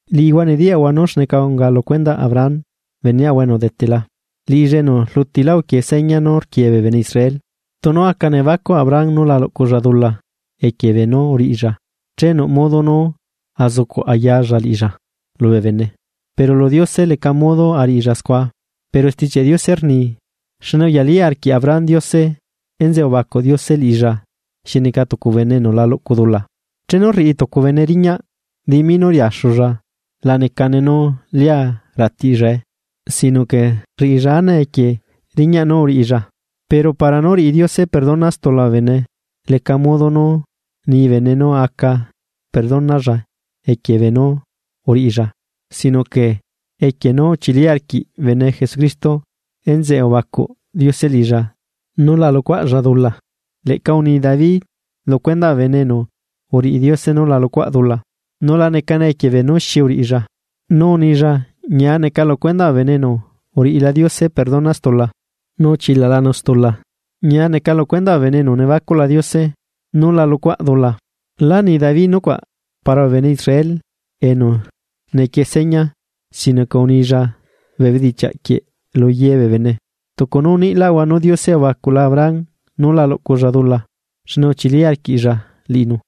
Liꞌihua nediyaꞌhua nú xneca unga lu cuendaꞌ Abraham beneꞌahua enu udetela, liꞌilla enu rlutila uquie seña nú rquie bee bene Israel. Tunu aca nebacuꞌ Abraham nú la luꞌculla dula equie beenú uriꞌilla, che nuꞌ modo nú azucuꞌ ayalla liꞌilla lubee bene, pero lu Diose leca modo ariꞌilla scua. Pero Stichiaꞌ Diose rni: “Xne uyali arquiꞌ Abraham Diose, enzeꞌe ubacuꞌ Diose liꞌilla xi neca tucu enu la luꞌcu dula.” Chenu rriꞌi tucu bene riñaꞌ, dimi nú riaxulla la necane nú lia ratiꞌllae sino que rriꞌilla anae equie riñaꞌ nú uriꞌilla. Pero para nú riꞌi Diose perdona stula bee bene, leca modo nu ni bene nu aca perdonalla equie beenú uriꞌilla, sino que equie nú uchili arquiꞌ bene Jesucristo enzeꞌe ubacuꞌ Diose liꞌilla nú la luꞌcuaꞌlla dula. Leꞌca uni David lu cuendaꞌ bee bene enu uriꞌi Diose nú la luꞌcuꞌa dula, nu la necane equie beenú xi uriꞌilla, nu unilla: Ñia neca lu cuendaꞌ bee bene enu uriꞌila Diose perdona stula, nu uchilalanu stula. Ñia neca lu cuendaꞌ bee bene enu nebacuꞌla Diose, nú la luꞌcuaꞌ dula. Lá ni David nucuaꞌ para bee bene Israel enu nequie seña, sino que unilla bee bedichiaꞌ quieꞌ lu yebee bene. Tucu nú uniꞌlaꞌahua nú Diose ubacuꞌla Abraham nú la luꞌculla dula xne uchili arquiꞌlla liꞌinu.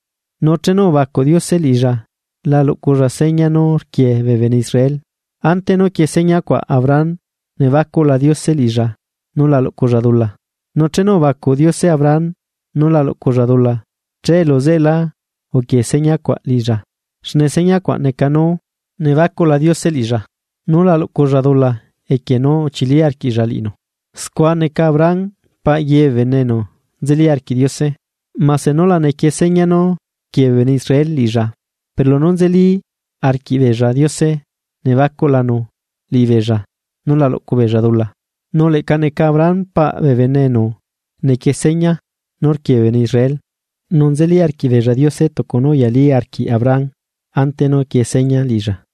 Nu chenu ubacuꞌ Diose liꞌilla la luꞌculla seña nú rquie bee bene Israel, ante nú quie señacuaꞌ Abraham nebacuꞌla Diose liꞌilla nú la luꞌculla dula. Nu chenu ubacuꞌ Diose Abraham nú la luꞌculla dula, che luzeꞌelá uquie señacuaꞌ liꞌilla, xne señacuaꞌ neca nú nebacuꞌla Diose liꞌilla nú la luꞌculla dula equie nú uchili arquiꞌlla liꞌinu. Scua neca Abraham paꞌ ye bee bene enu nzeli arquiꞌ Diose, mase nú la nequie seña nú rquie bee bene Israel liꞌilla, pero lunú nzeli arquiꞌbeella Diose nebacuꞌlanu liꞌibeella, nú la luꞌcu beella dula. Nu leꞌca neca Abraham paꞌ bee bene enu nequie seña nú rquie bee bene Israel, nu nzeli arquiꞌbeella Diose tucu nú uyali arquiꞌ Abraham, ante nú quie seña liꞌilla.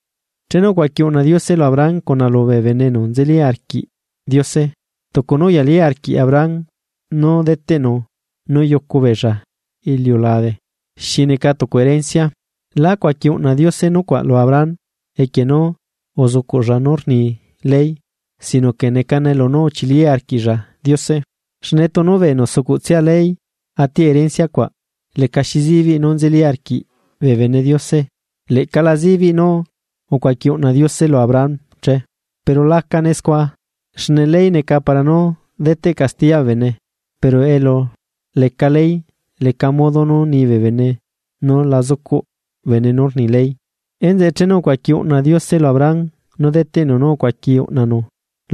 Chenu ucuaqui uꞌna Diose lu Abraham cuna lubee bene enu nzeli arquiꞌ Diose, tucu nú uyali arquiꞌ Abraham nú deteꞌnu nú yucu beella iliulabe xi neca tucu erencia. Lá cuaqui uꞌna Diose nucuaꞌ lu Abraham, equie nú uzucuꞌlla nú rni ley, sino que necane lunú uchili arquiꞌlla Diose. Xne tunu bee enu sucuꞌtsia ley atiꞌ erencia cuaꞌ, lecaxi sibiꞌ nú nzeli arquiꞌ bee bene Diose, leꞌca la zibiꞌ nú ucuaqui uꞌna Diose lu Abraham che. Pero lacane scua, xne ley neca para nú deteꞌ castiya bee bene pero elu leca ley leca modo nú ni bee bene nú la zucuꞌ bene nú rni ley. Enzeꞌe chenu ucuaqui uꞌna Diose lu Abraham nú deteꞌnu nú ucuaqui uꞌnanu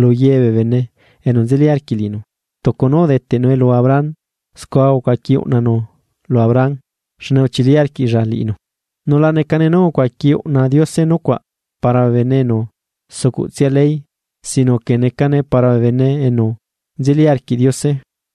lu ye bee bene enu nzeli arquiꞌ liꞌinu, tucu nú udeteꞌnue lu Abraham scua ucuaqui uꞌnanu lu Abraham xne uchili arquiꞌlla liꞌinu, nu la necane nú ucuaqui uꞌna Diose nucuaꞌ para bee bene enu sucuꞌtsia ley sino que necane para bee bene enu nzeli arquiꞌ Diose,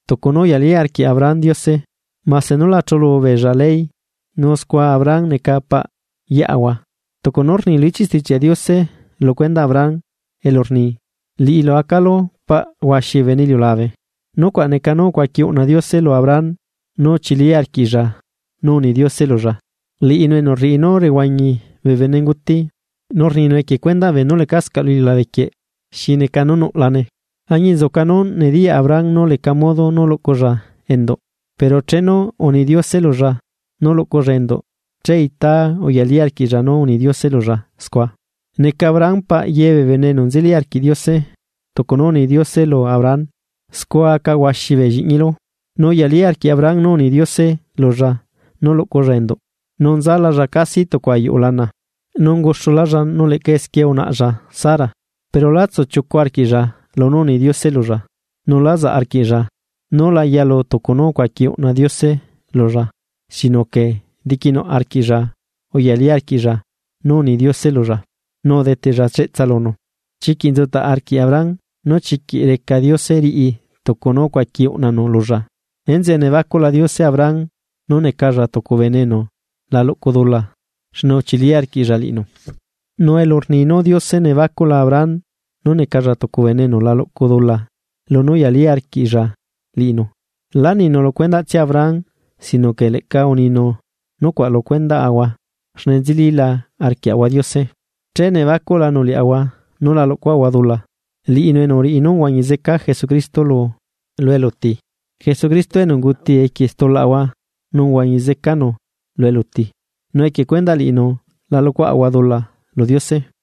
tucu nú uyali arquiꞌ Abraham Diose, mase nu la chulu beella ley, nu scua Abraham neca paꞌ yeꞌahua. Tucu nú rni lu ichiꞌ Stichiaꞌ Diose lu cuendaꞌ Abraham, elu rni: “Liꞌilu acalu paꞌ huaxi bee bene iliulabe.” Nucuaꞌ neca nú ucuaqui uꞌna Diose lu Abraham, nu uchili arquiꞌlla nú uni Diose lulla, liꞌinu enu rriꞌi nú rehuañi bee benenguti nu rninu equie cuendaꞌ beenú lecascaꞌ lu iliulabe quieꞌ xi neca nú nuꞌlane. Añinzuca nú nediyaꞌ Abraham nú leca modo nú luꞌculla enduꞌ, pero chenu uni Diose lulla nú luꞌculla enduꞌ che ita uyali arquiꞌlla nú uni Diose lulla scua, neca Abraham “paꞌ ye bee bene”, enu nzeli arquiꞌ Diose, tucu nú uni Diose lu Abraham: “Scua aca huaxi bee lliꞌñilu.” Nu uyali arquiꞌ Abraham nú uni Diose lulla nú luꞌculla enduꞌ, nu nzalalla casi tucu ayuꞌu lana, nu unguxulalla nu leꞌca esquie unaꞌlla Sara, pero lá tsuchiucu arquiꞌlla lunú uni Diose lulla. Nu lá zaꞌ arquiꞌlla núla yalu tucu nú ucuaqui uꞌna Diose lulla sino que diquinuꞌ arquiꞌlla uyali arquiꞌlla nú uni Diose lulla, nu udeteꞌlla cheꞌtsa lunu. Chiquiꞌ nzutaꞌ arquiꞌ Abraham nú chiquiꞌ reca Diose riꞌi tucu nú ucuaqui uꞌnanu lulla. Enzeꞌe nebacuꞌla Diose Abraham nú necalla tucu bene enu la luꞌcu dula xne uchili arquiꞌlla liꞌinu. Nu elu rni nú Diose nebacuꞌla Abraham nú necalla tucu bene enu la luꞌcu dula, lunú uyali arquiꞌlla liꞌinu, láninu lu cuendaꞌtsia Abraham, sino que leꞌca uninu nucuaꞌ lu cuendaꞌahua, xne nzelila arquiaꞌahua Diose, che nebacuꞌlanu liaꞌahua nú la luꞌcuaꞌahua dula, liꞌinu enu uriꞌi nú uhuañi zeca Jesucristo lu eluti. Jesucristo enu unguti equie stulaꞌahua nu uhuañi zecanu lu eluti nu equie cuendaꞌ liꞌinu la luꞌcuaꞌahua dula lu Diose.